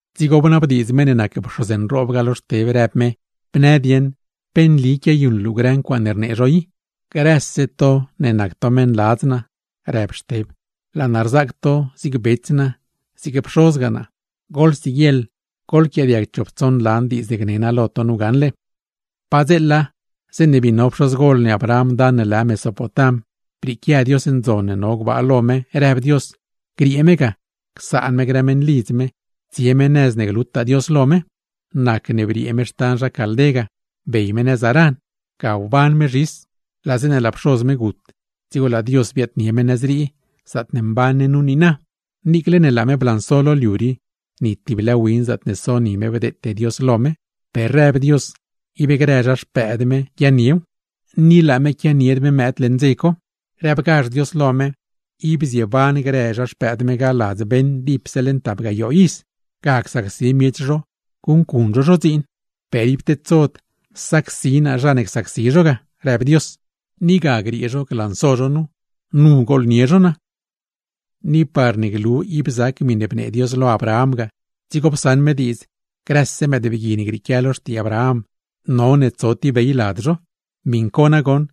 Dzigo bnabdiidz meṉ ne nac pxoz nroob ga lo Xteb, rëb me: ―¿Bnë dieṉ pe nli quiayuṉ luu grë ncuaaṉe rnee zho i? ―Grëse to ne nac to meṉladz naa ―rëb Xteb―, laa naa rzaac to zig bets naa, zig pxozgaa naa. Goḻsiguieḻ goḻquiaadiag chop tsoṉ lan diidz ne gne naa lo to nu gaṉle: Padzeela, zeeṉe bii no pxozgol ne Abraham dan ne lë Mesopotam, brieequia Dios ndzon ne no gbaa lo me, rëb Dios griee me ga, csaṉ me grë meṉlidz me, tsie me nëz ne glutaa Dios lo me. ’Nacne briee me xtan zha Caldé ga, bey me nëz Harán, ga wban me zhis. Laa zeeṉe laa pxoz me gut, dzigo laa Dios biaadnie me nëz rii, zaatne mban ne nu niina. Niicle ne laa me blanso lo liu rii, ni tib lë win zaatne so ni me bdeete Dios lo me; per rëb Dios ib grë zha xpëëd me guiaaṉniew. ¡Ni laa me quianied mëëd leṉ dze co! Rëbgazh Dios lo me, ib zieban grë zha xpëëd me ga ladz beṉ dipse leṉ tap gayoo iz, ga csacsi miech zho guṉcuṉ zho zho dziin. “Per ib tedsod sacsi naa zha ne csacsi zho ga”, rëb Dios, “ni ga griee zho glanso zho nu, nu gooḻnie zho naa.” ’Ni parne glu ib zac miṉe bnee Dios lo Abraham ga, dzigo psaṉ me diidz grëse mëëdbgui ne grieequia lo xtii Abraham none tso tib bey lad zho. Miṉ co nagoṉ,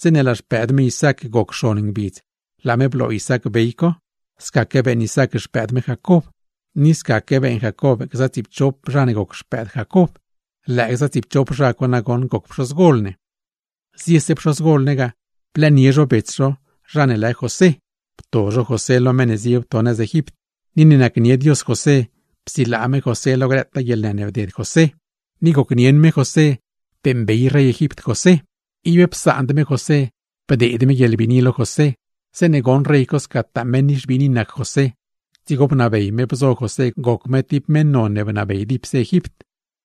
zeeṉe laa xpëëd me Isaac goc xon ngbidz, laa me bloo Isaac bey co. Scaque beeṉ Isaac xpëëd me Jacob, ni scaque beeṉ Jacob gza tsiipchop zha ne goc xpëëd Jacob; lëë gza tsiipchop zha co nagoṉ goc pxozgol ne. ’Ziese pxozgol ne ga, blëënie zho bets zho zha ne lë José, pto zho José lo meṉ ne zie wto nëz Egipt. Ni ne nacnie Dios José, psilaa me José lo grëtaa guieḻnë ne bded José, ni gocnieṉ me José beeṉbey rey Egipt José. Ib psaand me José, bdeed me guieḻbiini lo José. Zeeṉe goṉ rey co scataa meṉ nixbiini nac José, dzigo bnabey me bzo José goc me tib meṉ non ne bnabey dipse Egipt;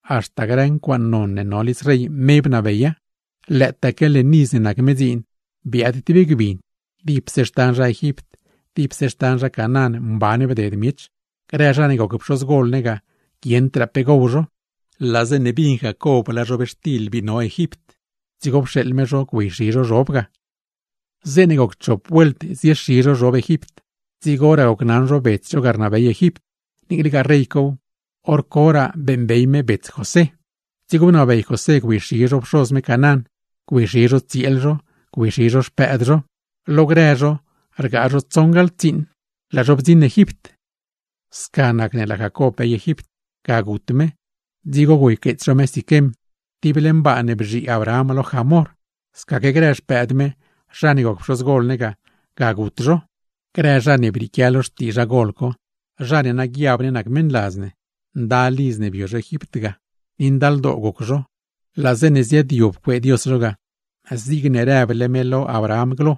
haxta grë ncuaaṉ non ne no lidz rey, me bnabeya. Lëëtaaque leṉ iz ne nac me dziin, biaad tib gbin; dipse xtan zha Egipt, dipse xtan zha Canaán mban bded miech. Grë zha ne goc pxozgol ne ga, guieṉdraa pe gow zho. Laa zeeṉe bin Jacob laa zhobxtil bii no Egipt, dzigo pxeeḻ me zho güeyxi zho zhob ga. ’Zeeṉe goc chop vuelt ziexi zho zhob Egipt, dzigoraa gocnaṉ zho bets zho ga rnabey Egipt; niiclegaa rey cow, hor coraa beeṉbey me bets José. Dzigo bnabey José güeyxi zho pxoz me Canaán, güeyxi zho tsieel zho, güeyxi zho xpëëd zho. Lo grë zho rgaa zho tsoṉgaḻ tsiiṉ, laa zho bdziṉ Egipt. ’Sca nacne laa Jacob bey Egipt. Ga gut me, dzigo güeyqueets zho me Siquem, tib leṉ baa ne bzhii Abraham lo Hamor; scaque grë xpëëd me zha ne goc pxozgol ne ga, ga gut zho. Grë zha ne brieequia lo xtii zha gol co, zha ne na guiab ne nac meṉladz ne, ndal iz ne bio zho Egipt ga, ni ndaldoo goc zho. Laa zeeṉe ziaadyob cuee Dios zho ga zigne rëble me lo Abraham glo,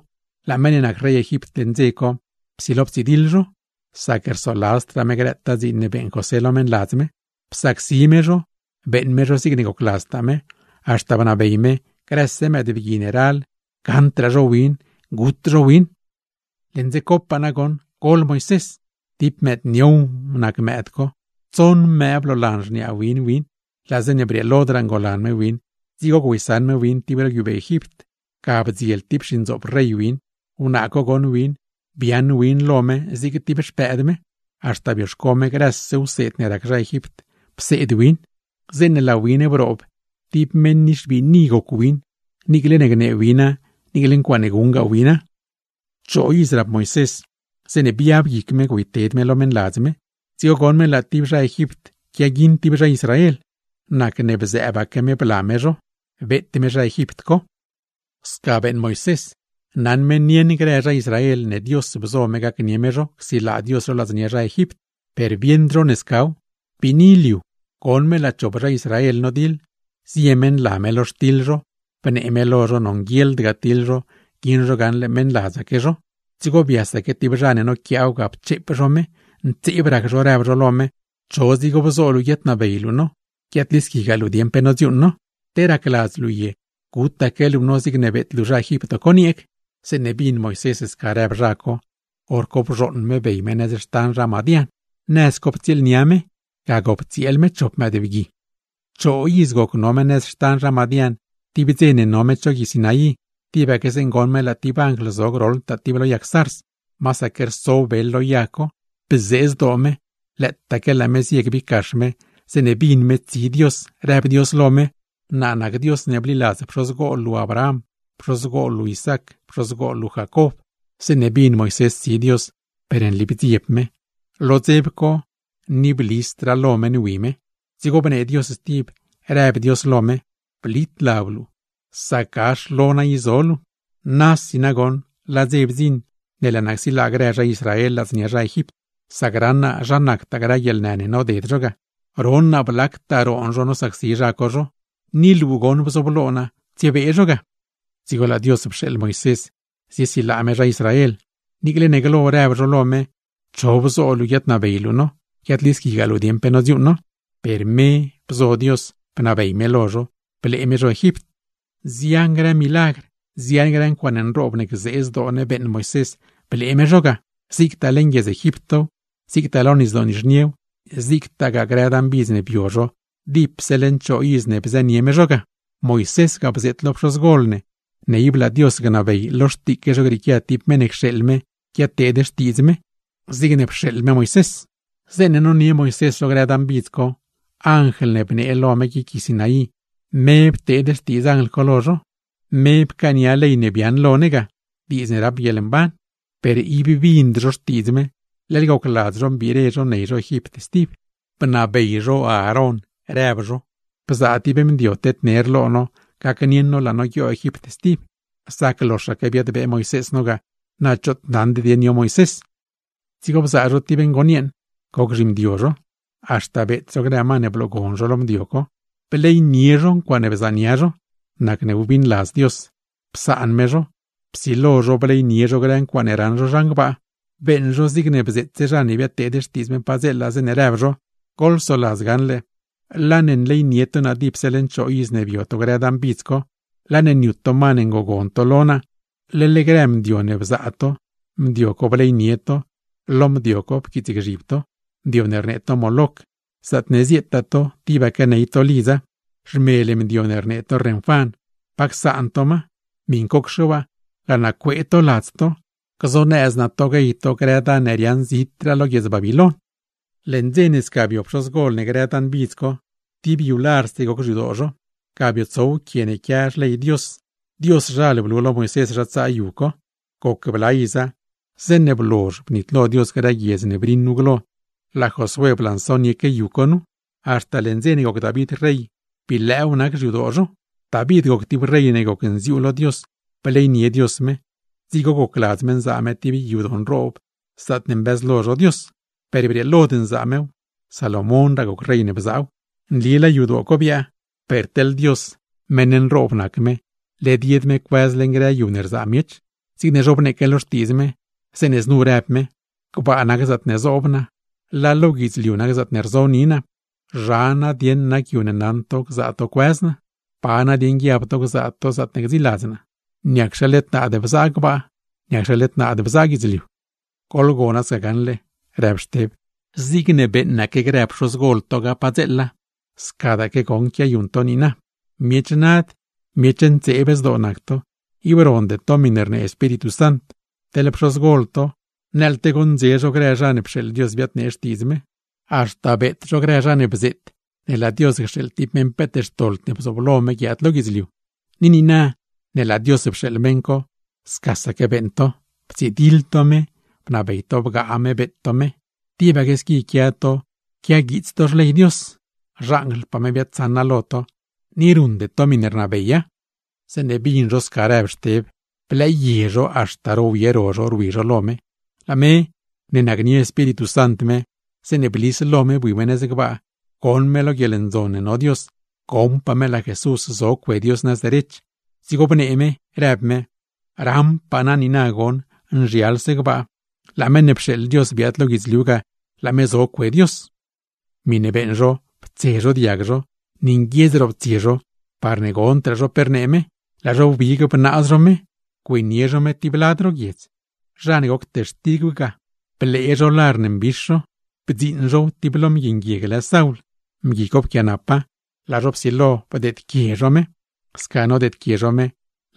laa meṉ ne nac rey Egipt leṉ dze co, psilo ptsidiḻ zho; sac rsoladzdraa me grëtaa dziin ne beeṉ José lo meṉladz me. Psacsi me zho, beeṉ me zho zigne gocladztaa me, haxta bnabey me grëse mëëdbgui ne ral gaṉdraa zho win parne guet win. ’Leṉ dze copaa nagoṉ gol Moisés, tib mëëd niow nac win. Tsoṉ mëë bloolan xniaa win win, laa zeeṉe brieelodraa ngolan me win, dzigo güeysaṉ me win tib ro guiubee Egipt, ga bdziel tib xindzoop rey win. Wnaa co goṉ win, biaaṉ win lo me zig tib xpëëd me; haxta bioxco me grëse wseed ne rac zha Egipt, pseed win. Zeeṉe laa win broob, tib meṉ nixbiini goc win, niicle ne gnee wina, niicle ncuaaṉe guṉgaa wina. ’Choo iz rap Moisés, zeeṉe biab guic me güeyted me lo meṉladz me. Dzigo goṉ me laa tib zha Egipt quiaguiṉ tib zha Israel; nacne bzëëbaque me bla me zho, beet me zha Egipt co. ’Sca beeṉ Moisés, naṉ me nieṉ grë zha Israel ne Dios bzo me gacnie me zho, csilaa Dios zho ladznia zha Egipt; per bieṉd zho ne scaw. Biini liu co, goṉ me laa chop zha Israel nodiḻ, zie me nla me lo xtiḻ zho, bnee me lo zho nonguieḻd ga tiḻ zho, guieṉ zho gaṉle meṉladzaque zho. Dzigo biasaque tib zha ne noquiaaw ga pcheep zho me, ntseeb rac zho rëb zho lo me: “¿Cho bzo luu guiaadnabey luu no, guiaadlisquigaa luu dieṉ pe nodziuuṉ no? ¿Te racladz luu ye gutaque luu no zigne beet luu zha Egipt co nieeg?” ’Zeeṉe bin Moisés sca rëb zha co, hor co bzhooṉ me bey me nëz xtan zha Madián. Nëz co ptsieelnia me, ga gop tsieel me chop mëëdbgui. ’Choo iz goc no me nëz xtan zha Madián, tib dze no me cho gui Sinaí, tibaque zeeṉe goṉ me laa tib anjl zo groḻtaa tib lo yag zarz, masaque rso bel lo yag co. Bzee zdoo me, lëëtaque laa me zie gbiggax me, zeeṉe bin me tsi Dios rëb Dios lo me: “Naa nac Dios ne bliladz pxozgol luu Abraham, pxozgol luu Isaac, pxozgol luu Jacob.” ’Zeeṉe bin Moisés tsi Dios, per nli bdzieb me; lo dzeb co per ni blisdraa me lo me nwi me. Dzigo bnee Dios stib, rëb me lo me: “Blit lab luu, sac gax lo naa i zo luu. Laa dze nagoṉ bdziṉ ne laa naa csilaa grë zha Israel ladznia zha Egipt; sac raṉ naa zha nactaa grë guieḻnë ne noded zho ga, ron naa blactaa roon zho nosacsi zha co zho. Ni luu bzooblo naa tsiebee zho ga.” ’Dzigo laa Dios pxeeḻ Moisés ziesilaa me zha Israel; niicle ne glo rëb zho lo me: “¿Cho bzo luu guiaadnabey luu no, guiaadlisquigaa luu dieṉ pe nodziuuṉ no?” Per me bzo Dios bnabey lo zho, blee me zho Egipt. ’Nzian grë milagr, nzian grë ncuaaṉe nroob ne gzee zdoo ne beeṉ Moisés blee me zho ga; zigtaa leṉ guiedz Egiptow, zigtaa lo Nisdoo Nizhniew, zigtagaa grë dan bidz ne bio zho dipse leṉ choo iz ne bzënie me zho ga. ’Moisés ga bzeet lo pxozgol ne, ne laa Dios gnabey lo xtiique zho grieequia tib meṉ ne cxeeḻ me guiadteed xtiidz me, zigne pxeeḻ me Moisés. ’Zeeṉe nonie Moisés zho grë dan bidz co, Anjl ne bnee lo me guic gui Sinaí, me pteed xtiidz Anjl co lo zho; me pcaania ley ne biaaṉ lo ne ga, diidz ne rap guieḻmban. Per ib bind zho xtiidz me, leḻ gocladz zho mbiire ney zho Egipt stib, bnabey zho Aarón rëb zho: “Bzaa tib mdio tedner lo no gacnieṉ no laa no guioo Egipt stib; sac loxaque biadbee Moisés no ga, na choot naṉd dieṉ yo Moisés.” ’Dzigo bzaa zho tib ngon yeeṉ goc zhimdio zho, haxta beet zho grë ma ne bloogon zho lo mdio co; bleynie zho ncuaaṉe bzaania zho. Nacne wbiṉladz Dios, psaan me zho; psilo zho bleynie zho grë ncuaaṉe raṉ zho zhan gbaa. Beeṉ zho zigne bzeetse zha ne biadteed xtiidz me padzeela, zeeṉe rëb zho: Goḻsoladz gaṉle, laa ne nleynie to naa dipse leṉ choo iz ne bio to grë dan bidz co, laa ne niut ma ne ngogon to lo naa, leḻ grë mdio ne bzaa to, mdio co bleynie to, lo mdio co pquiitsgzhib to. Mdio ne rnee to Moloc, zaatne zieetaa to tibaque ney to lidza, zhmel mdio ne rnee to Renfán, pa csaan to ma. Miṉcocxe waa, laa naa cuee to ladz to, gzonëz naa to guey to grë dan ne riaaṉ zitraa lo guiedz Babiloin. ’Leṉ dze ne sca bio pxozgol ne grë dan bidz co, tib yu larse goc xyadoo zho, ga biotsow quie ne quia xley Dios. Dioszhal blu lo Moisés zha tsaa yu co. Goc bla iza, zeeṉe blozh bnitlo Dios grë guiedz ne briṉ nu glo, laa Josué blansonieque yu co. Haxta leṉ dze ne goc David rey, bii lëëw nac xyadoo zho. ’David goc tib rey ne gocnziuu lo Dios, bleynie Dios me, dzigo gocladz me nzaa me tib yadoo nroob zaatne mbëzlo zho Dios. Per brieelod nzaa mew, Salomónraa goc rey ne bzaaw. Nli laa yadoo co biaa, per teḻ Dios, meṉ nroob nac me, led yed me cuëz leṉ grë yu ne rzaa miech. Zigne zhobneeque lo Xtiidz me, zeeṉe znu rëb me: Gbaa nac zaatne zoob naa, laa lo guidzliu nac zaatne rzo ni naa. ¿Zha nadieṉ nac yu ne naṉ to gzaa to cuëz naa? ¿Pa nadieṉ guiab to gzaa to zaatne gdziiladz naa? ¿Niacxe led naad bzaa gbaa?, ¿niacxe led naad bzaa guidzliu? ’Goḻgona sca gaṉle ―rëb Xteb―, zigne beeṉaque grë pxozgol to ga padzeela, scadaaque goṉ quiayuṉ to niina. Miech nad, miech ntseeb zdoo nac to; ib ronde to miṉe rnee Espíritu Sant. Teḻ pxozgol to, nëḻte goṉdze zho grë zha ne pxeeḻ Dios biadnee xtiidz me; haxta beet zho grë zha ne bzeet ne laa Dios cxeeḻ tib meṉ peet xtoḻd ne bzooblo me guiaad lo guidzliu. Ni niina ne laa Dios pxeeḻ meṉ co, scasaque beeṉ to, ptsidiḻ to me, bnabey to bgaa me beet to me. Tibaque squi quia to quiaguiits to Xley Dios; xanjlpaa me biaadsaṉa lo to, ni ruṉde to miṉe rnabeya. Zeeṉe bin zho sca rëb Xteb, blëëye zho haxta rowye ro zho rwi zho lo me. Laa me, ne nacnie Espíritu Sant me, zeeṉe blis lo me bui me nëz gbaa, goṉ me lo guieḻndzon ne no Dios, goṉpaa me laa Jesús zo cue Dios nëz derech. Dzigo bnee me, rëb me: ―Raṉpaa naa niina goṉ nzhialse gbaa, laa meṉ ne pxeeḻ Dios biaad lo guidzliu ga, laa me zo cue Dios. Miṉe beeṉ zho ptse zho diag zho, ni nguiedz roptsie zho parne gondraa zho pe rnee me; laa zho wbigbe bnaaz zho me, güeynie zho me tib lad ro guiedz. Zha ne goc textigw ga, blee zho lar ne mbix zho, bdziiṉ zhow tib lo mgui nguieg lë Saul, mgui co pquianapa; laa zho psilo bdeedquie me. Sca nodeedquie zho me,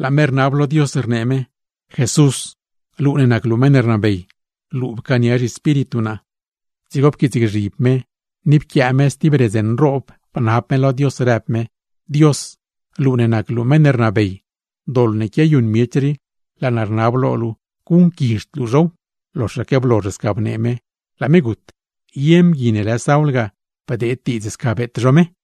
laa me rnab lo Dios rnee me: ―Jesús, luu ne nac luu meṉ ne rnabey, luu pcaania zhiespíritu naa. Dzigo pquiitsgzhib me, ni pquiaa me stib redz nroob bnab me lo Dios, rëb me: ―Dios, luu ne nac luu meṉ ne rnabey, doḻ ne quiayuṉ miech rii, laa naa rnab lo luu guṉquizhd luu zhow. Loxaque blozh sca bnee me, laa me gut. Ye mgui ne lë Saul ga, bdeed diidz sca beet zho me.